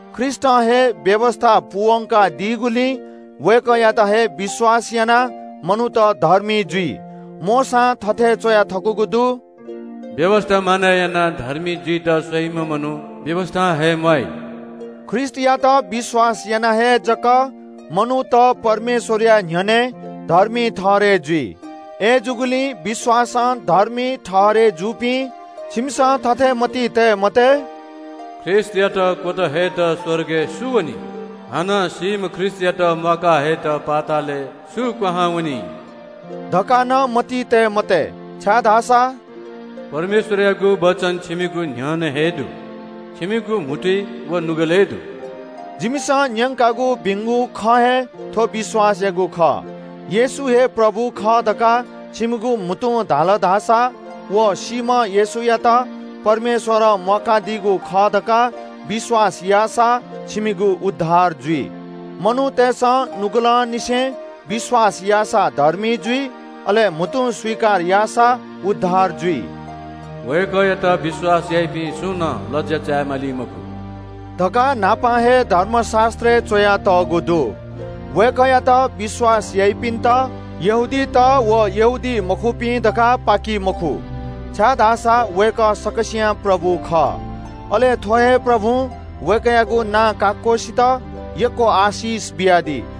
ख्रीष्‍टं हे व्‍यवस्‍था पूवंका दीगुलिं वय्‌कःयात हे विश्‍वास यानाः मनूत धर्मी जुइ। मोशां थथे च्‍वया थकूगु दु – “व्‍यवस्‍था मानय् यानाः धर्मी जुइत स्‍वइम्‍ह मनू व्‍यवस्‍थां हे म्‍वाइ।” ख्रीष्‍टयात विश्‍वास याना हे जक मनूत परमेश्‍वरया न्‍ह्यःने धर्मी ठहरय् जुइ। अय्‌जूगुलिं विश्‍वासं धर्मी ठहरय् जूपिं छिमिसं थथे मतिइ तये मते – “ख्रीष्‍टयात क्‍वत हयेत स्‍वर्गय् सु वनी?” हानं “सीम्‍ह ख्रीष्‍टयात म्‍वाका हयेत पातालय् सु क्‍वहां वनी?” धकाः नं मतिइ तये मते। परमेश्‍वरयागु वचन छिमिगु न्‍ह्यःने हे दु, छिमिगु म्‍हुतुइ व नुगलय् दु। जिमिसं न्‍यंकागु भिंगु खँ हे थ्‍व विश्‍वासयागु खः। येशू हे प्रभु खः धकाः छिमिगु म्‍हुतुं धाल धाःसा व सीम्‍ह येशूयात परमेश्‍वरं म्‍वाकादीगु खः धकाः विश्‍वास याःसा छिमिगु उद्धार जुइ। मनूतय्‌सं नुगलंनिसें विश्‍वास याःसा धर्मी जुइ, अले म्‍हुतुं स्‍वीकार याःसा उद्धार जुइ। वय्‌कःयात विश्‍वास याइपिं सुनानं लज्‍या चाय् माली मखु धकाः न्‍हापां हे धर्मशास्‍त्रय् च्‍वयातःगु दु। वय्‌कःयात विश्‍वास याइपिन्‍त यहूदीत व यहूदीमखुपिं धकाः पाकी मखु, छाय्‌धाःसा वय्‌कः सकसियां प्रभु खः। अले थ्‍व हे प्रभुं वय्‌कःयागु नां काक्‍वसित यक्‍व आशिष बियादी।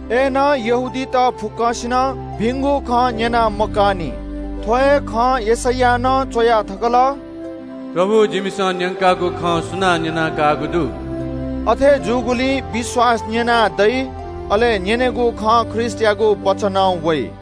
अय्‌नं यहूदीत फुक्‍कसिनं भिंगु खँय् न्‍हाय्‌पं मब्‍यूनि। थ्‍व हे खँ यशैयां नं च्‍वया थकल – “प्रभु, जिमिसं न्‍यंकागु खँय् सुनां विश्‍वास याःगु दु?” अथे जूगुलिं विश्‍वास न्‍यनाः दइ, अले न्‍यनेगु खँ ख्रीष्‍टयागु वचनं वइ।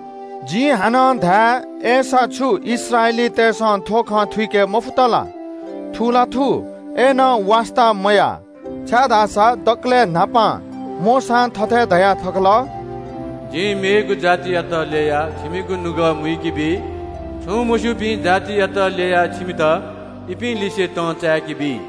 जिं हानं धाये – अय्‌सा छु इस्राएलीतय्‌सं थ्‍व खँ थुइके मफुत ला? थु ला थू, अय्‌नं वास्‍ता मयाः, छाय्‌धाःसा दकलय् न्‍हापां मोशां थथे धया थकल – “जिं नं थः मखुपिं मनूतपाखें इमिगु नुगः मुइके, छगू मूर्ख जातियापाखें इमित तं चाय्‌के।”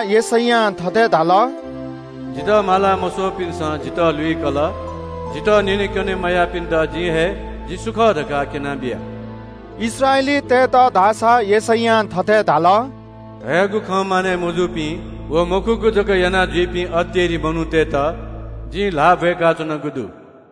यशैयां अज्‍ज मग्‍यासे धाल – “जितः माला मस्‍वःपिन्‍सं जितः लुइकल। जितः न्‍यनेकने मयाःपिन्‍त जिं हे जि सु खः धकाः क्‍यनाबिया।” इस्राएलीतय्‌त धाःसा परमेश्‍वरं थथे धाःगु दु – “धयागु खँ मानय् मजुइपिं व मखुगु जक यानाजुइपिं अतेरि मनूतय्‌त न्‍हिच्‍छि जिं ल्‍हाः ब्‍वय्‌काच्‍वनागु दु।”